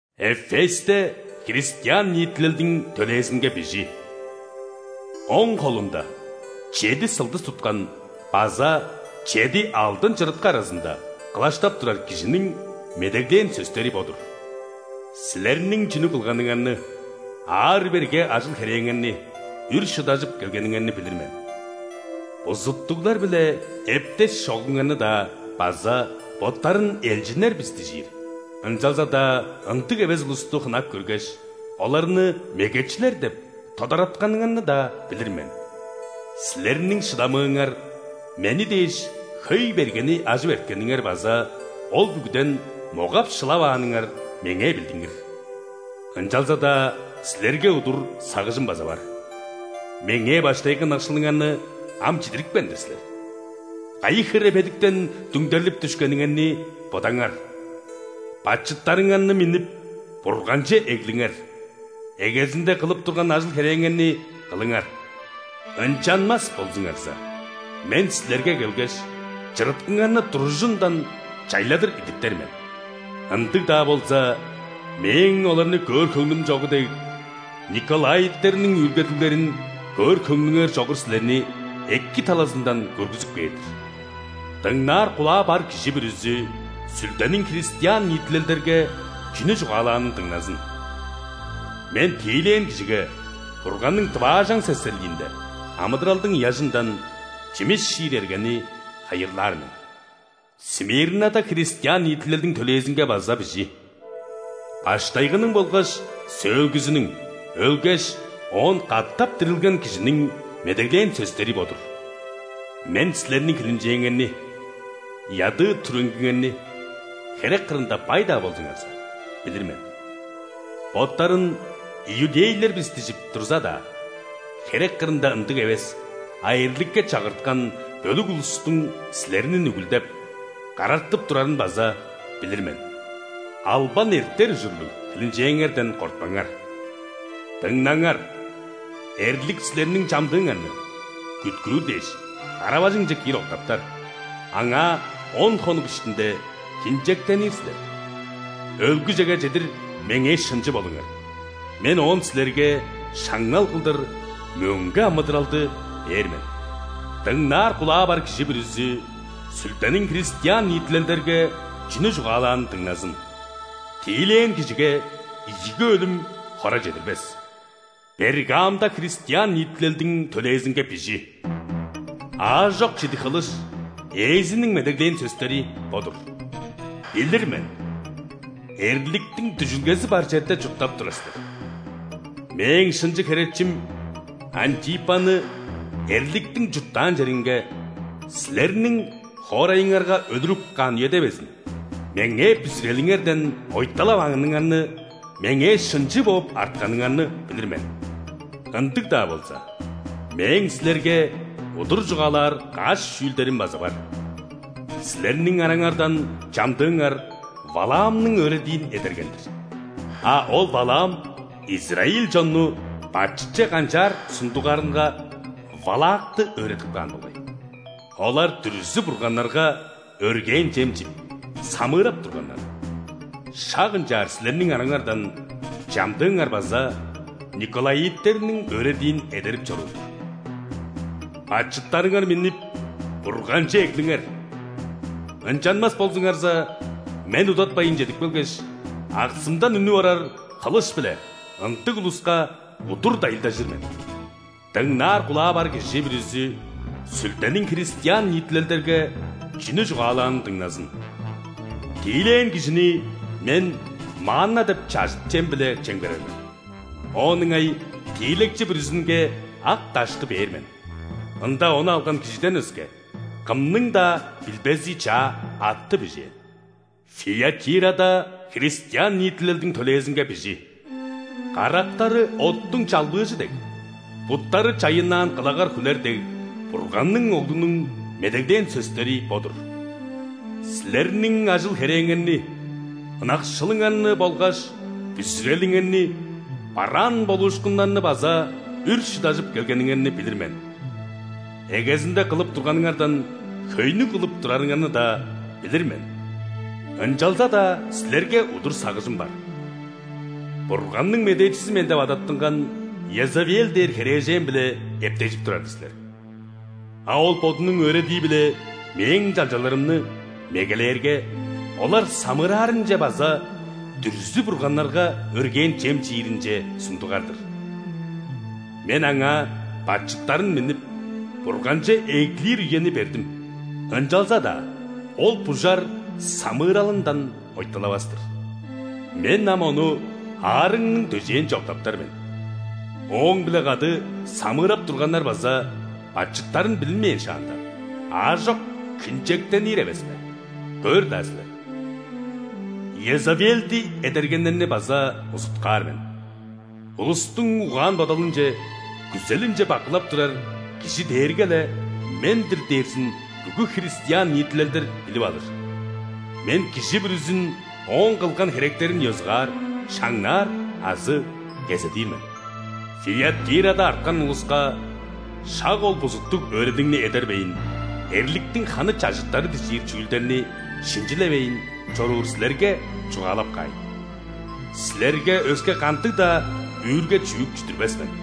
«Эфесте христиан ниитилелдиң төлээзинге бижи: Оң холунда чеди сылдыс туткан база чеди алдын чырыткы аразында кылаштап турар Кижиниң медеглээн сөстери бо-дур. Силерниң чүнү кылганыңарны, аар-берге ажыл-херээңерни, үр шыдажып келгениңерни билир мен. Бузуттуглар-биле эптеш чогуңарны-даа база боттарын элчиннер бис дижир, ынчалза-даа ындыг эвес улусту хынап көргеш, оларны мегечилер деп тодаратканыңарны-даа билир мен. Силерниң шыдамыыңар, Мени дээш хөй бергени ажып эрткениңер база ол бүгүден могап-шылавааныңар меңээ билдингир. Ынчалза-даа силерге удур сагыжым база бар: Меңээ баштайгы ынакшылыңарны ам чидирипкен-дир силер. Кайы хире бедиктен дүңдерлип дүшкениңерни бодаңар! Бачыттарыңарны миннип, Бурганче эглиңер, эгезинде кылып турган ажыл-херээңерни кылыңар. Ынчанмас болзуңарза, Мен силерге келгеш, чырыткыңарны туружундан чайладыр идиптер мен. Ындыг-даа болза, Мээң оларны көөр хөңнүм чогу дег, николаиттерниң үүлгедиглерин көөр хөңнүңер чогу силерни эки талазындан көргүзүп кээр-дир. Дыңнаар кулаа бар кижи бүрүзү Сүлдениң христиан ниитилелдерге чүнү чугаалаанын дыңназын. Мен тиилээн кижиге Бурганның дываажаң-сесерлиинде амыдыралдың ыяжындан чимис чиир эргени хайырлаар мен». «Смирнада христиан ниитилелдиң төлээзинге база бижи: Баштайгының болгаш Сөөлгүзүнүң, өлгеш, оон катап дирилген Кижиниң медеглээн сөстери бо-дур. Мен силерниң хилинчээңерни, ядыы-түреңгиңерни (херек кырында бай-даа болзуңарза) билир мен. Боттарын „иудейлер бис“ дижип турза-даа, херек кырында ындыг эвес, а эрликке чагырткан бөлүк улустуң силерни нүгүлдеп, карартып турарын база билир мен. Албан эртер ужурлуг хилинчээңерден кортпаңар. Дыңнаңар, эрлик силерниң чамдыыңарны, күткүүр дээш, кара-бажыңче киир октаптар, аңаа он хонук иштинде хинчектенир силер. Өлгүжеге чедир Меңээ шынчы болуңар, Мен оон силерге шаңнал кылдыр мөңге амыдыралды бээр мен. Дыңнаар кулаа бар кижи бүрүзү Сүлдениң христиан ниитилелдерге чүнү чугаалаанын дыңназын. Тиилээн кижиге ийиги өлүм хора чедирбес!» «Пергамда христиан ниитилелдиң төлээзинге бижи: Аажок чидиг хылыш Ээзиниң медеглээн сөстери бо-дур. Билир мен: эрликтиң дүжүлгези бар черде чурттап турар силер. Мээң шынчы херечим Антипаны эрликтиң чурттаан черинге – силерниң хоорайыңарга өлүрүп каан үеде безин Меңээ бүзүрелиңерден ойталавааныңарны, Меңээ шынчы бооп артканыңарны билир мен. Ындыг-даа болза, Мээң силерге удур чугаалаар каш чүүлдерим база бар: силерниң араңардан чамдыыңар Валаамның өөредиин эдерген-дир. А ол Валаам израиль чонну бачытче канчаар сундугарынга Валакты өөредип каан болгай. Олар дүрзү-бурганнарга өргээн чем чип, самыырап турганнар. Шак ынчаар силерниң араңардан чамдыыңар база николаиттерниңR өөредиин эдерип чоруур-дур. Бачыттарыңар миннип, Бурганче эглиңер! Ынчанмас болзуңарза, Мен удатпайн чедип келгеш, аксымдан үнүп орар хылыш-биле ындыг улуска удур дайылдажыр мен. Дыңнаар кулаа бар кижи бүрүзү Сүлдениң христиан ниитилелдерге чүнү чугаалаанын дыңназын. Тиилээн кижини Мен манна деп чажыт чем-биле чемгерер мен. Оон ыңай тиилекчи бүрүзүнге ак дашты бээр мен: ында ону алган кижиден өске, кымның-даа билбези чаа атты бижээн». «Фиатирада христиан ниитилелдиң төлээзинге бижи: Карактары оттуң чалбыыжы дег, буттары чайыннаан кылагар хүлер дег Бурганның Оглунуң медеглээн сөстери бо-дур. Силерниң ажыл-херээңерни, ынакшылыңарны болгаш бүзүрелиңерни, бараан болуушкунуңарны база үр шыдажып келгениңерни билир мен. Эгезинде кылып турганыңардан хөйнү кылып турарыңарны-даа билир мен. Ынчалза-даа силерге удур сагыжым бар: Бурганның медээчизи мен деп адаттынган Иезавел дээр херээжен-биле эптежип турар-дыр силер. А ол бодунуң өөредии-биле Мээң чалчаларымны мегелээрге, олар самыыраарынче база дүрзү-бурганнарга өргээн чем чииринче сундугар-дыр. Мен аңаа бачыттарын миннип, Бурганче эглир үени бердим, ынчалза-даа ол бужар самыыралындан ойталавас-тыр. Мен ам ону аарыгның дөжээнче октаптар мен, ооң-биле кады самыырап турганнар база бачыттарын билинмээн шаанда, аажок хинчектенир эвеспе, көөр-даа силер. Иезавелди эдергеннерни база узуткаар мен. Улустуң угаан-бодалынче, күзелинче бакылап турар Кижи дээрге-ле Мен-дир дээрзин бүгү христиан ниитилелдер билип алыр. Мен кижи бүрүзүн ооң кылган херектерин ёзугаар шаңнаар азы кезедир мен. Фиатирада арткан улуска – шак ол бузуттуг өөредигни эдербейн, эрликтиң ханы чажыттары дижир чүүлдерни шинчилевейн чоруур силерге чугаалап каайн: силерге өске кандыг-даа үүрге-чүък чүдүрбес мен.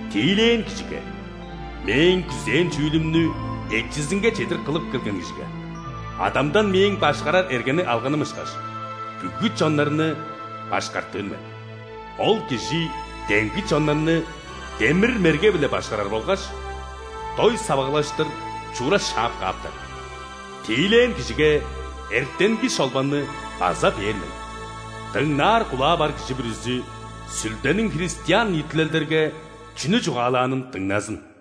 Тиилээн кижиге – Мээң күзээн чүүлүмнү эчизинге чедир кылып келген кижиге, Адамдан Мээң башкарар эргени алганым ышкаш, бүгү чоннарны башкартыр мен. Ол кижи демги чоннарны демир мерге-биле башкарар болгаш дой савагылаштыр чуура шаап кааптар. Тиилээн кижиге эртенги шолбанны база бээр мен. Дыңнаар кулаа бар кижи бүрүзү Сүлдениң христиан ниитилелдерге чүнү чугаалаанын дыңназын».